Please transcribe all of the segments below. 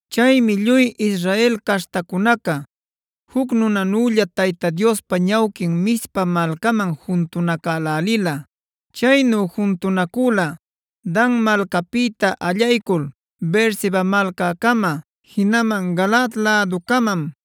Chaymi lluy Israel caśhtacunaca juc nunanülla Tayta Diospa ñawquin Mizpa malcaman juntunacälälila. Chaynu juntunacüla Dan malcapïta allaycul Beerseba malcäcama, jinaman Galaad läducamam.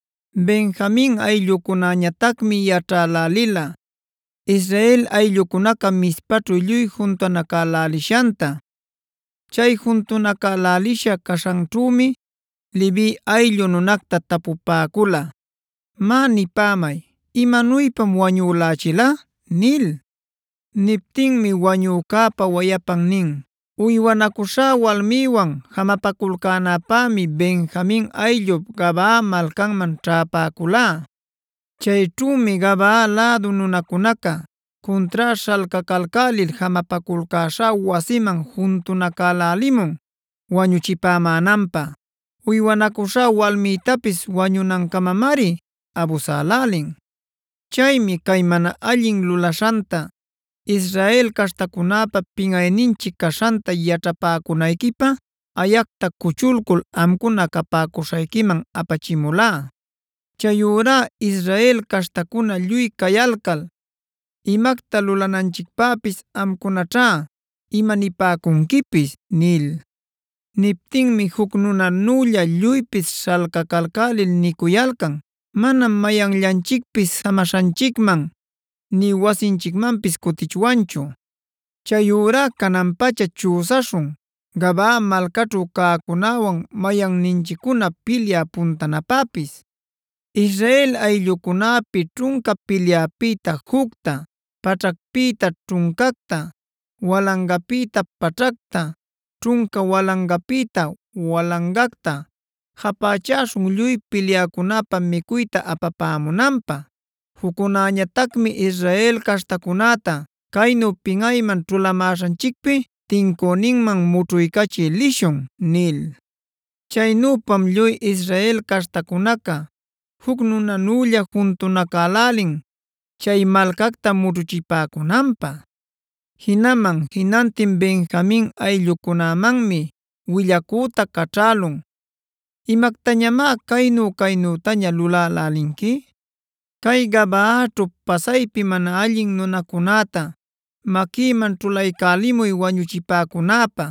Benjamin ayllucunäñatacmi yaćhälälila Israel ayllucunaca Mizpaćhu lluy juntunacälälishanta. Chay juntunacälälisha caśhanćhümi Levi ayllu nunacta tapupäcula: “Má nipämay, ¿imanuypam wañülächila?” nil. Niptinmi wañücäpa wayapan nin: “Uywanacuśhá walmïwan jamapaculcänäpämi Benjamin ayllup Gabaa malcanman ćhäpäculá. Chayćhümi Gabaa lädu nunacunaca cuntrá śhalcacalcälil jamapaculcäśhá wasiman juntunacälälimun wañuchipämänanpä. Uywanacuśhá walmïtapis wañunancamamari abusälälin. Chaymi cay mana allin lulaśhanta, Israel caśhtacunäpa pinꞌayninchic caśhanta yaćhapäcunayquipä ayacta cuchulcul amcuna capäcuśhayquiman apachimulá. Chayurá Israel caśhtacuna lluy cayalcal, imacta lulananchicpäpis amcunaćhá imanipäcunquipis” nil. Niptinmi juc nunanülla lluypis śhalcacalcälil nicuyalcan: “Manam mayanllanchicpis jamaśhanchicman nï wasinchicmanpis cutichwanchu. Chayurá canan-pacha chüsaśhun Gabaa malcaćhu cäcunäwan mayanninchiccuna pilyä puntanapäpis. Israel ayllucunäpi ćhunca pilyäpïta jucta, paćhacpïta ćhuncacta, walangapïta paćhacta, ćhunca walangapïta walangacta japächaśhun lluy pilyäcunäpä micuyta apapämunanpä. Juccunäñatacmi Israel caśhtacunäta caynu pinꞌayman ćhulamäśhanchicpi tincüninman mućhuycachï lishun” nil. Chaynüpam lluy Israel caśhtacunaca juc nunanülla juntunacälälin chay malcacta mućhuchipäcunanpä. Jinaman jinantin Benjamin ayllucunämanmi willacüta caćhälun: “¿Imactañamá caynu-caynütaña lulälälinqui? Cay Gabaaćhu pasaypi mana allin nunacunäta maquïman ćhulaycälimuy wañuchipäcunäpä.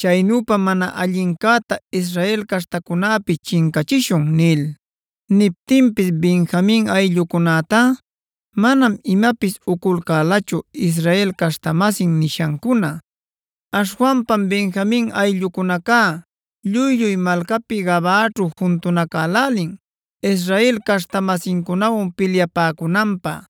Chaynüpam mana allincäta Israel caśhtacunäpi chincachishun” nil. Niptinpis Benjamin ayllucunätá manam imapis uculcälachu Israel caśhta-masin nishancuna. Aśhwanpam Benjamin ayllucunaca lluy-lluy malcapi Gabaaćhu juntunacälälin Israel caśhta-masincunawan pilyapäcunanpä.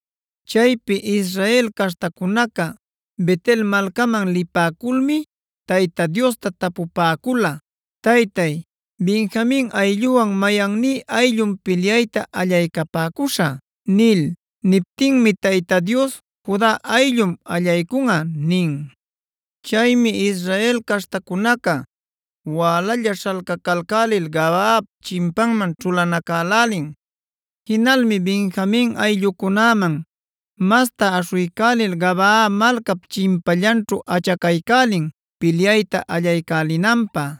Chaypi Israel caśhtacunaca Bet-el malcaman lipäculmi Tayta Diosta tapupäcula: “Taytay, ¿Benjamin aylluwan mayanní ayllum pilyayta allaycapäcuśhä?” nil. Niptinmi Tayta Dios: “Juda ayllum allaycunꞌa” nin. Chaymi Israel caśhtacunaca wälalla śhalcacalcälil Gabaap chimpanman ćhulanacälälin. Jinalmi Benjamin ayllucunäman masta aśhuycälil Gabaa malcap chimpallanćhu achacaycälina pilyayta allaycälinanpä.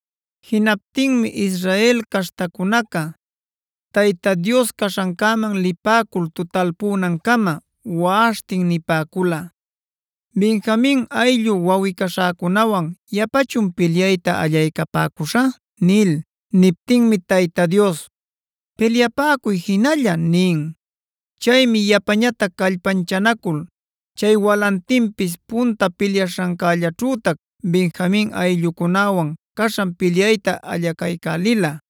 Jinaptinmi Israel caśhtacunaca Tayta Dios caśhancäman lipäcul tutalpunancama waꞌaśhtin nipäcula: “¿Benjamin ayllu wawꞌi-caśhäcunawan yapachun pilyayta allaycapäcuśhä?” nil. Niptinmi Tayta Dios: “Pilyapäcuy jinalla” nin. Chaymi yapañatac callpanchanacul chay walantinpis punta pilyaśhancällaćhütac Benjamin ayllucunäwan caśhan pilyayta allacaycälila.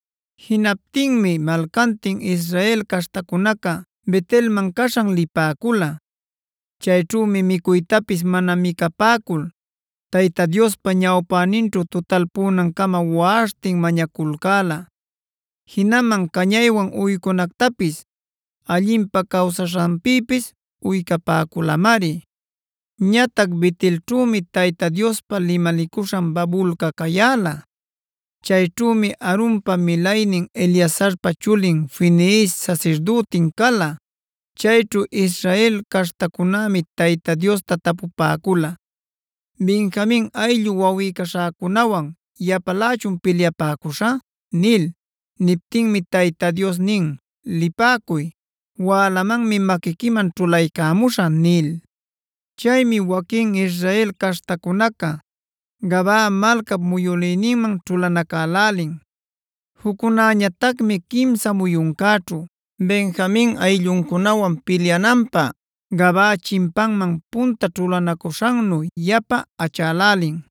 Jinaptinmi malcantin Israel caśhtacunaca Bet-elman caśhan lipäcula. Chayćhümi micuytapis mana micapäcul Tayta Diospa ñawpäninćhu tutalpunancama waꞌaśhtin mañaculcäla. Jinaman cañaywan uycunactapis, allinpä cawsaśhanpïpis uycapäculamari. Ñatac Bet-elćhümi Tayta Diospa limalicuśhan babulca cayäla. Chayćhümi Aaronpa milaynin Eleazarpa chulin Finees sasirdütin cala. Chayćhu Israel caśhtacunämi Tayta Diosta tapupäcula: “¿Benjamin ayllu wawꞌi-caśhäcunawan yapalächun pilyapäcuśhä?” nil. Niptinmi Tayta Dios nin: “Lipäcuy. Wälamanmi maquiquiman ćhulaycämuśhä” nil. Chaymi waquin Israel caśhtacunaca Gabaa malcap muyülïninman ćhulanacälälin. Juccunäñatacmi quimsa muyuncäćhu Benjamin aylluncunawan pilyananpä Gabaapa chimpanman punta ćhulanacuśhannu yapa achälälin.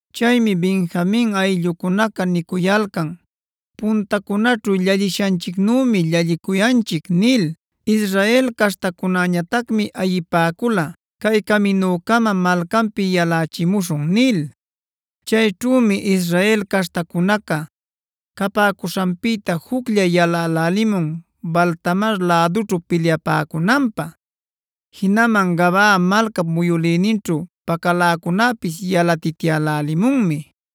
Chaymi Benjamin ayllucunaca nicuyalcan: “Puntacunaćhu llallishanchicnümi llallicuyanchic” nil. Israel caśhtacunäñatacmi ayipäcula: “Cay caminucama malcanpi yalächimuśhun” nil. Chayćhümi Israel caśhtacunaca capäcuśhanpïta juclla yalälälimun Baal-tamar lädućhu pilyapäcunanpä; jinaman Gabaa malcap muyülïninćhu pacaläcunäpis yalatityälälimunmi.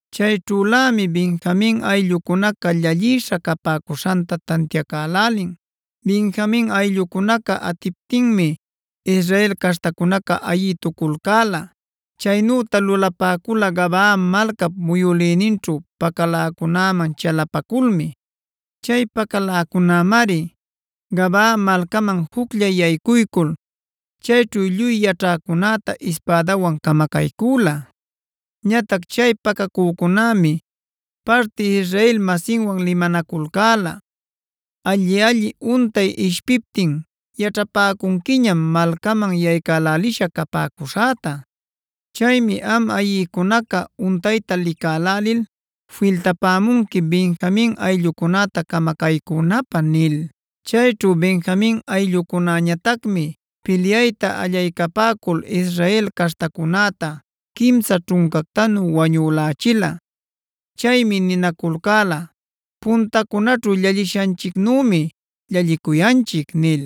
Chayćhülämi Benjamin ayllucunaca llallïsha capäcuśhanta tantiacälälin. Benjamin ayllucunaca atiptinmi Israel caśhtacunaca ayïtuculcäla. Chaynüta lulapäcula Gabaa malcap muyülïninćhu pacaläcunäman chalapaculmi. Chay pacaläcunämari Gabaa malcaman juclla yaycuycul chayćhu lluy yaćhäcunäta ispädawan camacaycüla. Ñatac chay pacacücunämi parti Israel-masinwan limanaculcäla: “Alli-alli untay ishpiptin yaćhapäcunquiñam malcaman yaycälälisha capäcuśhäta. Chaymi am ayïcunaca untayta licälälil filtapämunqui Benjamin ayllucunäta camacaycünäpä” nil. Chayćhu Benjamin ayllucunäñatacmi pilyayta allaycapäcul Israel caśhtacunäta quimsa ćhuncactanu wañülächila. Chaymi ninaculcäla: “Puntacunaćhu llallishanchicnümi llallicuyanchic” nil.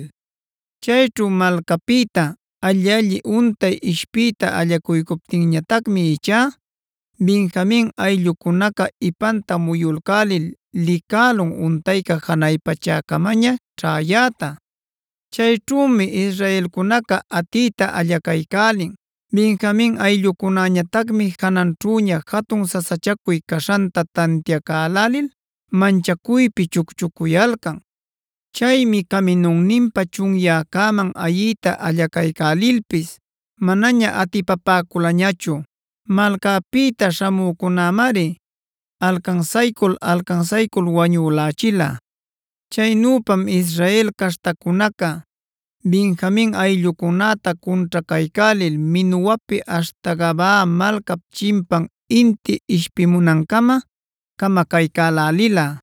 Chayćhu malcapïta alli-alli untay ishpiyta allacuycuptinñatacmi ichá Benjamin ayllucunaca ipanta muyulcälil licälun untayca janay pachäcamaña ćhäyäta. Chayćhümi israelcunaca atiyta allacaycälin. Benjamin ayllucunäñatacmi jananćhüña jatun sasachacuy caśhanta tantiacalälil manchacuypi chucchucuyalcan. Chaymi caminunninpa chunyäcäman ayiyta allacaycälilpis manaña atipapäculañachu. Malcapïta śhamücunämari alcansaycul-alcansaycul wañülächila. Chaynüpam Israel caśhtacunaca Benjamin ayllucunäta cunćhacaycälil Menuhuapi aśhta Gabaa malcap chimpan inti ishpimunancama camacaycälälila.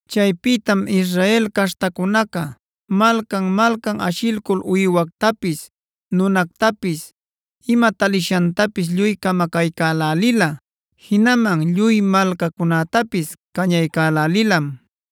Chaypïtam Israel caśhtacunaca malcan-malcan ashilcul uywactapis, nunactapis, ima talishantapis lluy camacaycälälila. Jinaman lluy malcacunätapis cañaycälälilam.